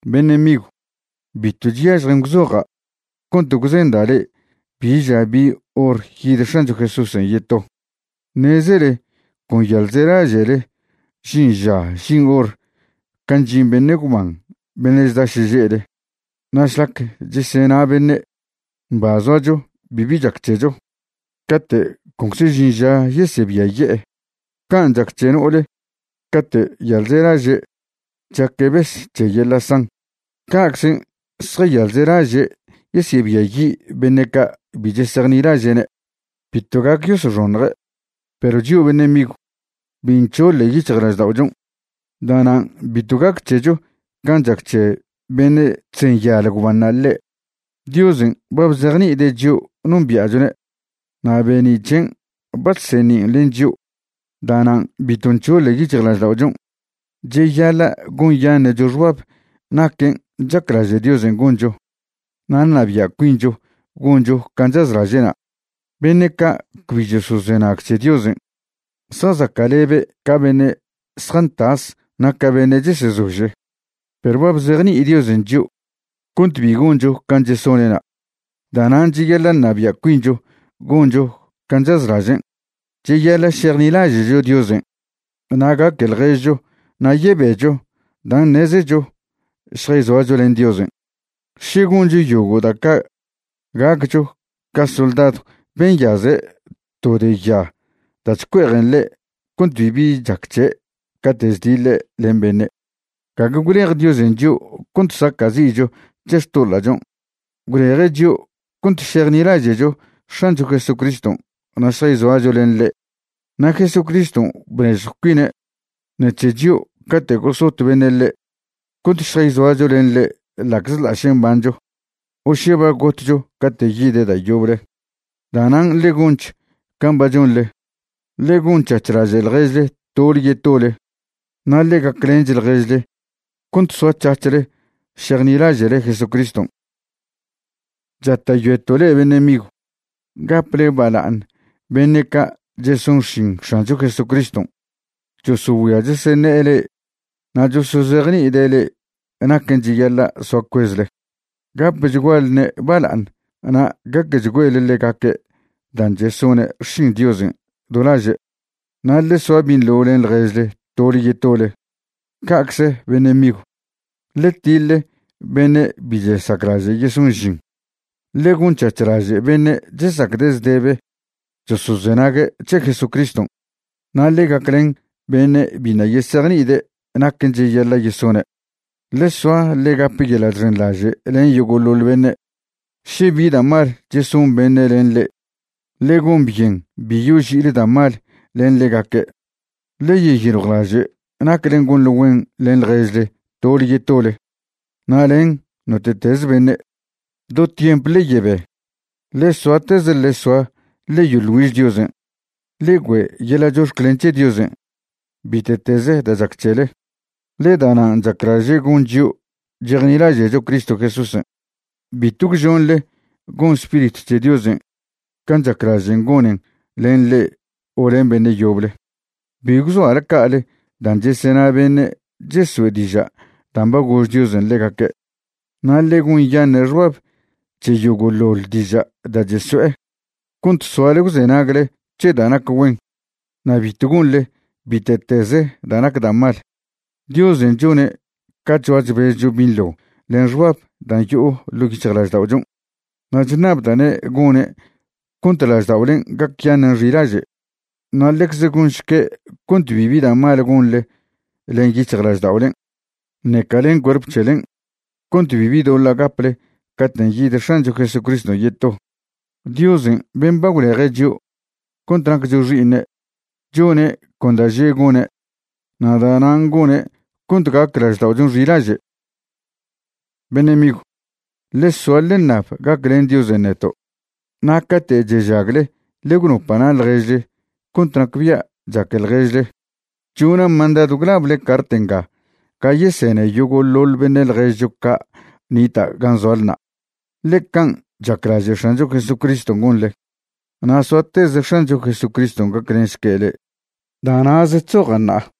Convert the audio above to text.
Beṉe' migw, bitw chyažjen gwzoja' cont gwzenda' le'e bi ža bi hor yid X̱ancho Jesúsen' yeto. Ṉezele con yalzelaže'le žin ža žin hor can' chžin beṉe' gwban beṉe' chda šeže'le. Na' šlac chesena beṉe': “Mba zoacho, bibi chac c̱hecho”, cate' concze žin ža yesebiaye'e. Can' chac c̱he no'ole cate' yalzelaže' chaque' bes c̱he yeḻa' san, ca'czen' zjayalzelaže' yesebiayi' beṉe' ca' bi chesejnilaže'ne'. Bitw gac yosoxoṉje'. Perw chio' beṉe' migw, bi nc̱hoḻe yic̱hjlažda'ochon', da'nan' bitw gac c̱hecho can' chac c̱he beṉe' chzenyal gwbanṉa' ḻe'. Diosen' ba bzejni'ide' chio' nombia'chone' na' be'ni' c̱hen' ba chseṉin' len chio'; da'nan' bitw nc̱hoḻe yic̱hjlažda'ochon'. Cheyaḻa' gonyaṉe'cho xbab naquen' chaclaže' Diosen' goncho na' ṉabia' cuincho goncho can' chazlaže'na'. Beṉe' ca' cbi chosozenag c̱he Diosen' zjazaca'lebe' ca beṉe' zjantas na' ca beṉe' chesezože. Perw ba bzejni'i Diosen' chio' cont bi goncho can' chesone'na'. Da'nan' cheyaḻa' ṉabia' cuincho goncho can' chazlažen'. Cheyaḻa' šejnilaže'cho Diosen' na' gaque ḻježcho na' yebecho dan' ṉezecho šjayzoacho len Diosen'. Še goncho yogo' da' ca' gaccho ca soldadw ben' nyaze' to de ya da' chcue'ejen ḻe' cont bibi chac c̱he' cate' chdiḻe' len beṉe'. Gague gwlej Diosen' chio' cont saca'zi'cho c̱he xtoḻa'chon'. Gwleje' chio' cont šejnilaže'cho X̱ancho Jesucriston' na' šjayzoacho len ḻe'. Na' Jesucriston' bnežjw cuine' ṉec̱he chio' cate' gosot beṉe' ḻe' cont šjayzoacho len ḻe' ḻa'czḻa' še mbancho o še ba gotcho cate' yide' da' yoble. Da'nan' ḻe gonch can' ba chonḻe, ḻe gon c̱hac̱h laže' ḻježle tole yetole na' ḻe gaclench ḻježle cont soac̱hac̱hle šejnilaže'le Jesucriston'. Chata'yoeto' le'e beṉe' migw, gaple bala'aṉ beṉe' ca' cheson xšin X̱ancho Jesucriston' chosogüia cheseṉe'e le'e na' chosozejni'ide' le'e naquen' cheyaḻa' soa cuezle. Gapchgualne' bala'aṉ na' gaquechgüele ḻegaque' dan' chesone' xšin Diosen' do laže'. Na' ḻe soa binḻo len ḻježle tole yetole. Ca'cze beṉe' migw, ḻe tiḻe beṉe' bi chesaclaže' yeson žin, ḻe gon c̱hac̱h laže' beṉe' chesacde' zdebe chosozenague' c̱he Jesucriston', na' ḻe gaclen beṉe' biṉa' yesejni'ide' naquen' cheyaḻa' yesone'. Ḻe soa ḻe gap yeḻa' chxenḻaže' len yogo'ḻoḻ beṉe'. Še bi da' mal cheson beṉe' len le'e, ḻe gon byen bi yoži'ile da' mal len ḻegaque'. Ḻe yeyiljwlaže' naclen' gonḻe güen len ḻježle tole yetole na' len note'tez beṉe'. Do tiemp ḻe yebe. Ḻe soateze ḻe soa ḻe yoḻ güiž Diosen'. Ḻe güe' yeḻa' chox̱clen c̱he Diosen' bite'tez da' chac c̱hele, ḻe da'nan' chaclaže' gon chio' chejnilaže'cho Cristo Jesúsen'. Bitw gwžonḻe gon Spiritw c̱he Diosen' can' chaclažen' gonen len le'e o len beṉe' yoble. Bi gwzoale ca'ale dan' chesena beṉe' cheso'e diža' dan' ba gož Diosen' ḻegaque'. Na' ḻe gonyaṉe' xbab c̱he yogo'ḻoḻ diža' da' cheso'e cont soale gwzenagle c̱he da' nac güen. Na' bitw gonḻe bite'tez da' nac da' mal. Diosen' chone' ca chzoa chbezcho binḻo len xbab dan' yo'o ḻo' yic̱hjlažda'ochon'. Na' chṉabda'ne' gone' cont lažda'olen' gacyaṉen' xilaže'. Na' ḻecze gonšque' cont bibi da' mal gonḻe len yic̱hjlažda'olen' ṉeca len cuerp c̱helen' cont bibi doḻa' gaple caten' yid X̱ancho Jesucriston' yeto. Diosen' ben' ba gwleje' chio' cont naccho xi'iṉe' chone' con da' že' gone', na' da'nan' gone' cont gac lažda'ochon' xilaže'. Beṉe' migw, ḻe soa ḻe ṉab gaclen Diosen' neto'. Na' cate' chežagle ḻe gwnopa' na' ḻježle cont nacbia' chaque ḻježle. Chona' mandadw gwlable cart nga ga yesene yogo'ḻoḻ beṉe' ḻježcho ca' nita' gan' zoalna', ḻe can' chaclaže' X̱ancho Jesucriston' gonḻe. Na' soateze X̱ancho Jesucriston' gaclenšque' le'e. Da' na'ze chzoja' ṉa'a.